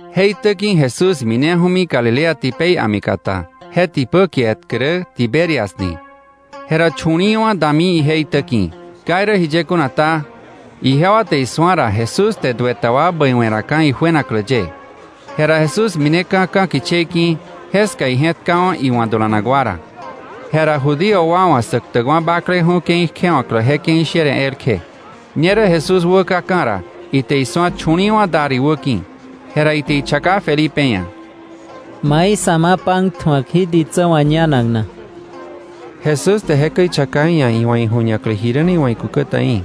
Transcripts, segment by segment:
Je itä ki̱ Jesús mineju̱mi Galilea tipei a̱mi kata, je tipä kie etkä rä Tiberias ni. Jera chu̱li̱i̱wa̱ dami ije itä ki̱. Ka irä jiye kuna ta, ijewa te isu̱a ra Jesús te duë ta wa bäiwe̱ raka̱ ijuenaklä ye. Jera Jesús mineka̱ ka̱ kichei ki̱, jeska ije̱tkawa̱ iwa̱ dulanak wa ra. Jera Judío wa wa̱ Säktäkwa̱ Bakleju̱ ke̱i kjewa̱klä je ke̱i sher ji̱a elkje. Ñerä Jesús wäkaka̱ ra, ite isu̱a chu̱li̱i̱wa̱ dar iwä ki̱. Jera ite ichaka Felipe ia̱: —¿Mai sa̱ ma pan tju̱ak jí ditsä wa̱ ñanak na? Jesús te jekäi ichaka iia̱ iwa̱ iju̱ñaklä jiräni iwa̱ ikúkä ta í̱,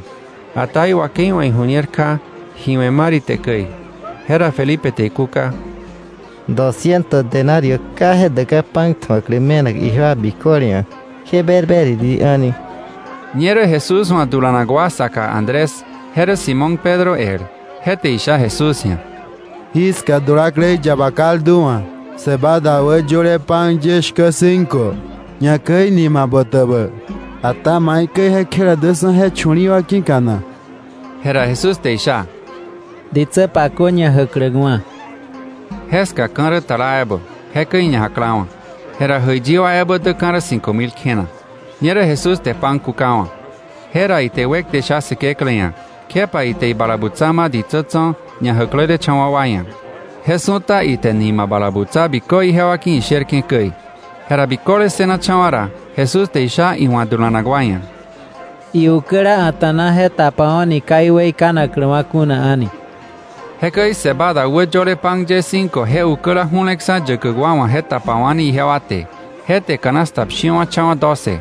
ata iwakei wa̱ iju̱ñer kja ji we̱ mar ite käi. Jera Felipe te ikúka: —Dosciento denario ka je däkka̱ pan tju̱aklä me̱nak ijewa biköle ia̱ kje berberiri a̱ni. Ñerä Jesús wa̱ dulanak wa saka Andrés, je rä Simón Pedro el, je te isha Jesús ia̱: —Jiska dulaklei yaba kaldu wa̱ cebada wä yöle pan ye shkä cinco, ñakäi nima botäbä, ata ¿maikäi je kjela däksa̱ je chu̱li̱i̱ wa ki̱ka na? Jera Jesús te isha: —Ditsä pakö ñajäkläkwa̱. Jeska ka̱ rä tala ebä, jekäi iñajaklawa̱. Jera jäiyi wa ebä däka̱ rä cinco mil kjena. Ñerä Jesús te pan kukawa̱. Jera ite wekte sha Säkeklä ia̱, kjepa ite ibala butsa ma̱ ditsä tso̱ ñajäklelecha̱wa̱ wa ia̱. Je su̱ta ite nima bala butsa bikö ijewa ki̱ isherke̱ käi. Jera biköle ssënacha̱wa̱ ra, Jesús te isha iwa̱ dulanak wa ia̱: —Iukäla a̱ta̱na je tapawo̱ni ka iweikanakläwa̱ kuna a̱ni. Jekäi cebada wä yöle pan ye cinco je ukäla ju̱leksa̱ yäkäk wa wa̱ je tapawa̱ni ijewa te, je te canasta pshiwa̱cha̱wa̱ doce.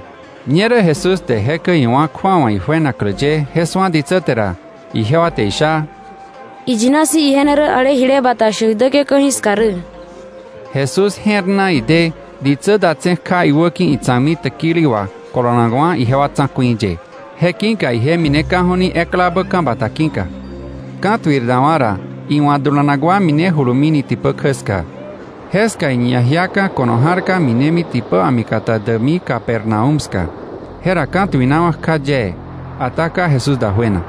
Ñerä Jesús te jekäi iwá̱ kju̱awa ijuenaklä ye je su̱a ditsä te ra, ijewa te isha: —Iyina si̱ ije ne rä ale jile bata shäk däke̱ ka̱jiska rä. Jesús je̱r na ide ditsä datse̱ kja iwäki̱ itsa̱kmi täkili wà kolonakwa̱ ijewa tsa̱ku̱i ye. Je ki̱ka ije mineka̱ju̱ni eklabä ka̱ bata ki̱ka. Ka̱tuir dawa̱ ra iwa̱ dulanak wa minejulumini tipä kjä ska. Jeska iñajiaka̱ ko̱no ja̱rka minemi tipä a̱mi kata däkmi Capernaúm ska. Jera ka̱tuinawa̱ kja yee, ata ka Jesús dajuena.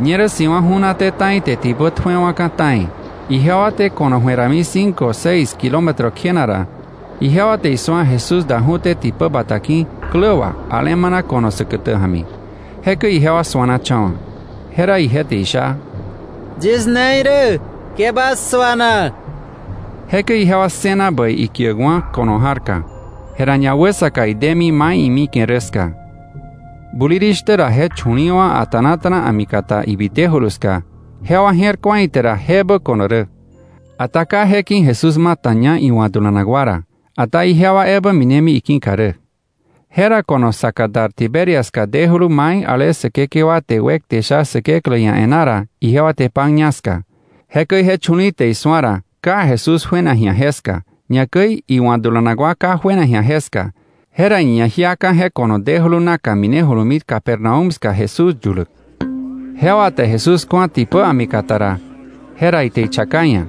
Ñerä si̱wa̱ ju̱naté ta̱i te tipä tjuewa̱ka̱ ta̱i. Ijewa te ko̱no ju̱e rami cinco seis kilómetro kjena ra, ijewa te isu̱a Jesús daju̱té tipä bata ki̱ klä wà alemana ko̱no säkätä ja̱mi. Jekäi ijewa suanacha̱wa̱. Jera ije te isha: —Yis ne irä, ke bas suana. Jekäi ijewa ssëna bäi ikiäkwa̱ ko̱no ja̱rka. Jera ñawäsaka idemi mai imike̱ rä ska. Bulirishtä ra je chu̱li̱i̱ wa a̱ta̱nata̱na a̱mi kata ibitejulu ska, jewa je̱r ku̱a ite ra jebä ko̱no rä, ata ka je ki̱ Jesús mataña iwa̱ dulanak wa ra, ata ijewa ebä minemi iki̱ka rä. Jera ko̱no saka dar Tiberias ska dejulu mai ale Säkekewa te wekte sha Säkeklä ia̱ e̱ná ra, ijewa te pan ña ska. Jekäi je chu̱li̱i̱ te isu̱a ra ka Jesús juena ji̱a jeska, ñakäi iwa̱ dulanak wa ka juena ji̱a jeska, jera iñajiaka̱ je ko̱no dejulu naka minejulumi Capernaúm ska Jesús yuläk. Jewa te Jesús ku̱a tipä a̱mi kataka ra, jera ite ichaka iia̱: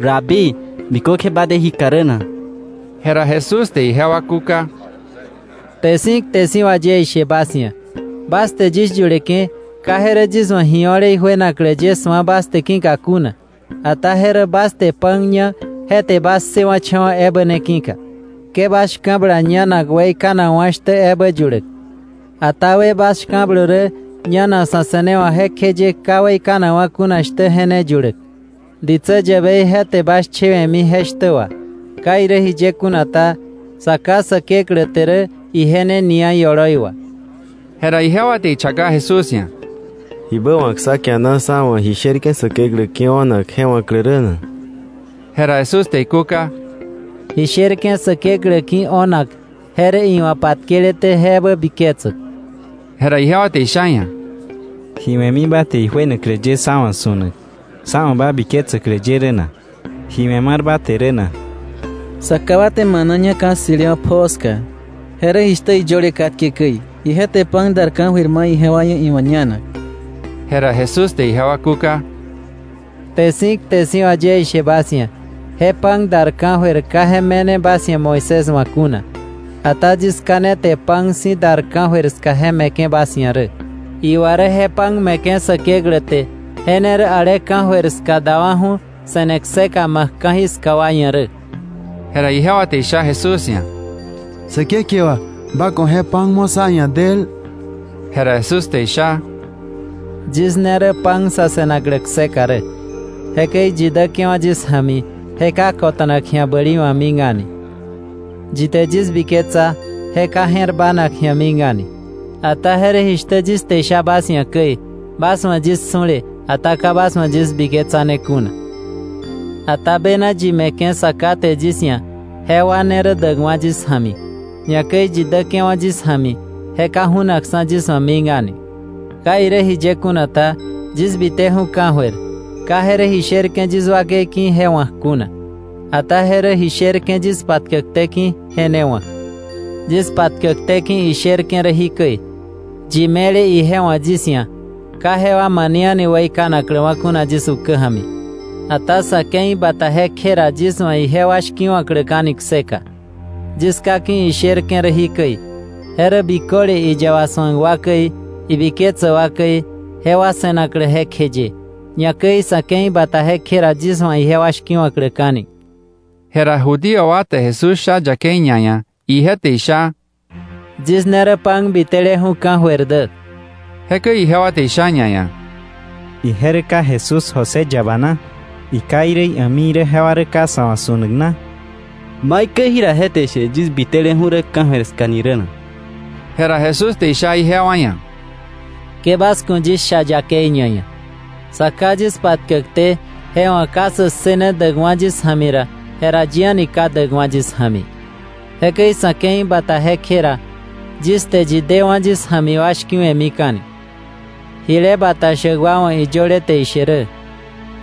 —Rabí, ¿bikökje ba de jí ka rä na? Jera Jesús te ijewa kúka: —Kte si̱ kte si̱ wà yie ishe bas ia̱, bas te yis yuleke̱, ka je rä yis wa̱ ji o̱le ijuenaklä ye je su̱a bas te ki̱ka kuna, ata je rä bas te pan ña je te bas ssëwa̱cha̱wa̱ ebä ne ki̱ka. Ke bas shka̱bla ñanak weikanakwa̱ shtä ebä yuläk, ata wë bas shka̱blö rä ñanak sa̱ se̱newa̱k jekjeye ka weikanakwa̱ kuna shtä je ne yuläk. Ditsä yäbei je te bas chewe̱mi je shtä wà. Ka irä jiye kuna ta, Sa Ká Säkeklä te rä ije ne nia ioloi wà. Jera ijewa te ichaka Jesús ia̱: —¿Jibä wa̱k sá kiana sá wa̱ ji sherke̱ Säkeklä ki̱ o̱nak je wa̱klä rä na? Jera Jesús te ikúka: —Ji sherke̱ Säkeklä ki̱ o̱nak je rä iwa̱ patkeleté je ebä biketsäk. Jera ijewa te isha iia̱: —¿Ji we̱mi ba te ijuenaklä ye sá wa̱ su̱nak sá wa̱ ba biketsäklä ye ra rä na? ¿Ji we̱ mar ba te rä na? Sá ká wa te maná ña ka̱ ssi̱lewa̱ pjoo ska. Je rä jishtä iyöle katke käi: ‘Ije te pan dar ka̱jöir ma̱ ijewa ia̱ iwa̱ ñanak.’ Jera Jesús te ijewa kúka: —Kte si̱ kte si̱ wà yie ishe bas ia̱, je pan dar ka̱jöir ka je me̱ne bas ia̱ Moisés wa̱ kuna. Ata yis Ká ne te pan si̱ dar ka̱jöir je me̱ke̱ bas ia̱ rä. Iwa rä je pan me̱ke̱ Säkeklä te, je ne rä ale ka̱jöir ska dawa̱ju̱ se̱ne kseka ma̱k ka̱jiska wa ia̱ rä. Jera ijewa te isha Jesús ia̱: —Säkekewa, ba ku̱ je pan mo̱ sá ia̱ del. Jera Jesús te isha: —Yis ne rä pan sa̱ se̱naklä kseka rä. Jekäi yi däke̱wa̱ yis ja̱mi, je ka kota̱nak ji̱a bäli wa̱ mik a̱ni. Yi te yis biketsa, je ka je̱r bának ji̱a mik a̱ni. Ata je rä jishtä yis te isha bas ia̱ käi, bas wa̱ yis su̱le, ata ka bas wa̱ yis biketsane kuna. Ata bena yi me̱ke̱ Sa Ká te yis ia̱, jewa ne rä däkwa̱ yis ja̱mi. Ñakäi yi däke̱wa̱ yis ja̱mi, je ka ju̱naksa̱ yis wa̱ mik a̱ni. Ka irä jiye kuna ta, yis biteju̱ ka̱jöir, ka je rä ji sherke̱ yis wakei ki̱ je wa̱k kuna, ata je rä ji sherke̱ yis patkäkté ki̱ je ne wa̱k. Yis patkäkté ki̱ isherke̱ rä jikäi: Yi me̱le ije wa̱ yis ia̱, ka jewa mane a̱ni weikanakläwa̱ kuna yis ukä ja̱mi, ata sa̱ ke̱i bata jekje ra yis wa̱ ijewa shki̱wa̱kläka̱ni kseka. Yis Ká ki̱ isherke̱ rä jikäi: je rä biköle iyaba su̱ak wa käi, ibiketsäk wa käi, jewa se̱naklä jekjeye; ñakäi sa̱ ke̱i bata jekje ra, yis wa̱ ijewa shki̱wa̱kläka̱ni. Jera Judío wa te Jesús sha yakei ñaia̱, ije te isha: “Yis ne rä pan biteleju̱ ka̱jöir dä,” je ki̱ka. Jekäi ijewa te isha ñaia̱: —¿Ije rä ka Jesús José yaba na? ¿Iká irä ia̱mi irä jewa rä ka sa̱ wa̱ su̱nak na? ¿Maikäi jira je te ishe yis biteleju̱ rä ka̱jöir ska ni rä na? Jera Jesús te isha ijewa ia̱: —Ke bas ku̱ yis sha yakei ñaia̱. Sa Ká yis patkäkté, je wa̱ ka sä ssëne däkwa̱ yis ja̱mi ra, jera yi a̱ni ka däkwa̱ yis ja̱mi. Jekäi sa̱ ke̱i bata jekje ra, yis te yi dewa̱ yis ja̱mi wa shki̱we̱mika̱ni. Jile bata shäk wa wa̱ iyöle te ishe rä: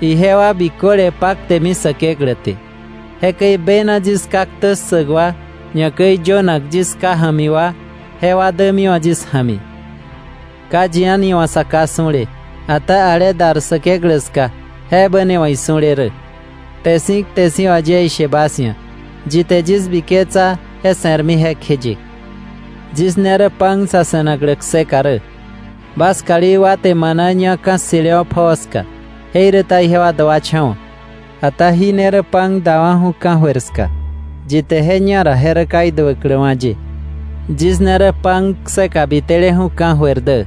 ‘Ijewa biköle paktemi Säkeklä te.’ Jekäi bena yis Ká ktä ssäk wa, ñakäi yönak yis Ká ja̱mi wa, jewa dämiwa̱ yis ja̱mi. “Ka yi a̱ni wa̱ Sa Ká su̱le; ata ale dar Säkeklä ska, jebä ne wa̱ isu̱le rä. Kte si̱ kte si̱ wà yie ishe bas ia̱, yi te yis biketsa je se̱rmi jekjeye. Yis ne rä pan sa̱ se̱naklä kseka rä. Bas kalí wa te maná ña ka̱ ssi̱lewa̱ pjoo ska, jeiräta ijewa duacha̱wa̱. Ata jí ne rä pan dawa̱ju̱ ka̱jöir ska, yi te je ñara je ka duäkläwa̱ ye rä. Yis ne rä pan kseka biteleju̱ ka̱jöir dä.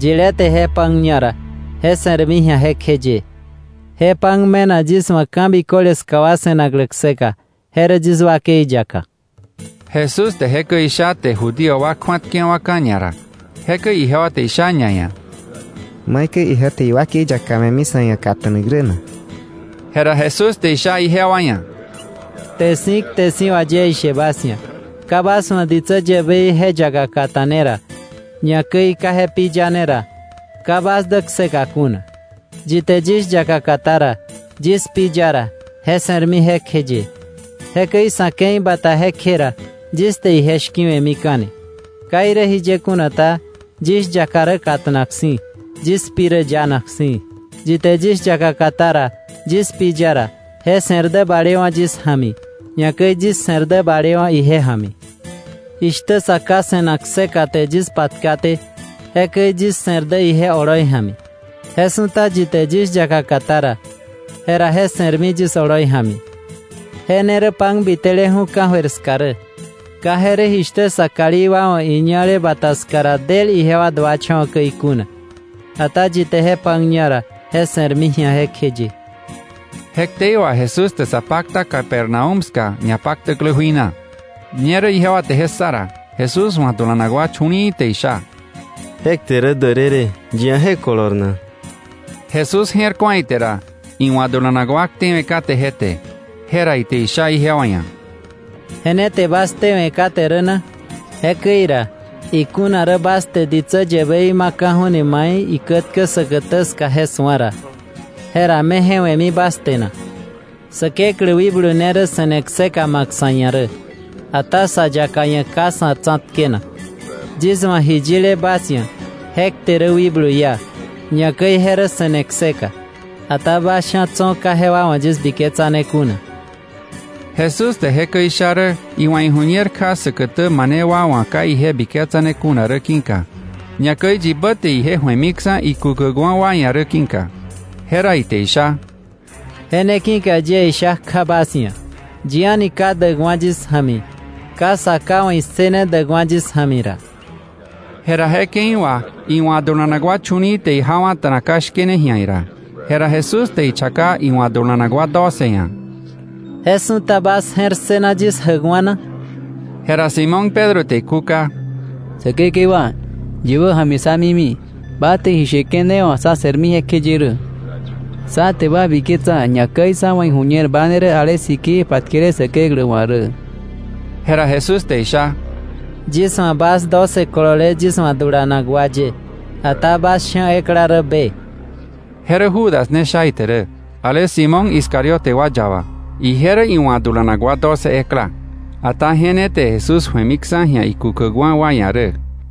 Yilé te je pan ñara, je se̱rmi ji̱a jekjeye. Je pan me̱nak yis wa̱ ka̱ biköle ska wa se̱naklä kseka, je rä yis wakei yaka.” Jesús te jekäi isha te Judío wa kju̱atkewa̱ka̱ ñara. Jekäi ijewa te isha ñaia̱: —¿Maikäi ije te iwakei yaka me̱mi sa̱ ia̱ kata̱nak rä na? Jera Jesús te isha ijewa ia̱: —Kte si̱ kte si̱ wà yie ishe bas ia̱, ka bas wa̱ ditsä yäbei je yaka kata̱ne ra, ñakäi ka je pi yane ra, ka bas dä kseka kuna. Yi te yis yaka katá ra, yis pi ya ra, je se̱rmi jekjeye. Jekäi sa̱ ke̱i bata jekje ra, yis te ije shki̱we̱mika̱ni. Ka irä jiye kuna ta, yis yaka rä kata̱nak si̱, yis pi rä yanak si̱. Yi te yis yaka katá ra, yis pi ya ra, je se̱r dä balewa̱ yis ja̱mi, ñakäi yis se̱r dä balewa̱ ije ja̱mi. Jishtä Sa Ká se̱nak kseka te yis patkaté, jekäi yis se̱r dä ije oloi ja̱mi, je su̱ta yi te yis yaka katá ra, jera je se̱rmi yis oloi ja̱mi. Je ne rä pan biteleju̱ ka̱jöir ska rä. Ka je rä jishtä sa kalí wa wa̱ iñale bata ska ra del ijewa duacha̱wa̱ käi kuna. Ata yi te je pan ña ra, je se̱rmi ji̱a jekjeye. Je ktei wà Jesús te sa pakta Capernaúm ska ñapaktäklä jui na. Ñerä ijewa te je ssa ra, Jesús wa̱ dulanak wa chu̱li̱i̱ te isha: —Je kte rä därërë. ¿Yi ia̱ je kolor na? Jesús je̱r ku̱a ite ra, iwa̱ dulanak wa ktewe̱ kate je te, jera ite isha ijewa ia̱: —¿Je ne te bas ktewe̱ kate rä na? Jekäi ra ikuna rä bas te ditsä yäbei ma̱ka̱ju̱ni mai ikätkä säkätä ska je su̱a ra, ¿jera me je we̱mi bas te na? Säkeklä wikblu ne rä se̱ne kseka ma̱k sa̱ ia̱ rä, ata sa yaka ia̱ ka sa̱ tsa̱tkenak. Yis wa̱ ji yile bas ia̱ je kte rä wikblu iá, ñakäi je rä se̱ne kseka. Ata bas sha̱ tso̱ ka jewa wa̱ yis biketsane kuna. Jesús te jekäi isha rä iwa̱ iju̱ñer kja säkätä mane wa wa̱ ka ije biketsane kuna rä ki̱ka, ñakäi yibä te ije ju̱emiksa̱ ikukäkwa̱ wa ia̱ rä ki̱ka. Jera ite isha: —Je ne ki̱ka yie isha kja bas ia̱, yi a̱ni ka däkwa̱ yis ja̱mi, ka Sa Ká wa̱ issëne däkwa̱ yis ja̱mi ra. Jera je ke̱i wà iwa̱ dulanak wa chu̱li̱i̱ te ijawa̱ta̱na ka shkene ji̱a ira. Jera Jesús te ichaka iwa̱ dulanak wa doce ia̱: —¿Je su̱ta bas je̱r ssëna yis jäkwa̱ na? Jera Simón Pedro te ikúka: —Säkekewa, ¿yibä ja̱mi sá mimi? Ba te ji sheke̱ ne wà sa̱ se̱rmi jekjeye rä. Sá te ba biketsa, ñakäi sá wa̱ iju̱ñer ba ne rä ale sikii patkele Säkeklä wa̱ rä. Jera Jesús te isha: —Yis wa̱ bas doce kolole yis wa̱ dulanak wa ye, ata bas sha̱ ekla rä be. Je rä Judas ne sha ite rä, ale Simón Iscariote wa yaba. Ije rä iwa̱ dulanak wa doce ekla, ata je ne te Jesús ju̱emiksa̱ ji̱a ikukäkwa̱ wa ia̱ rä.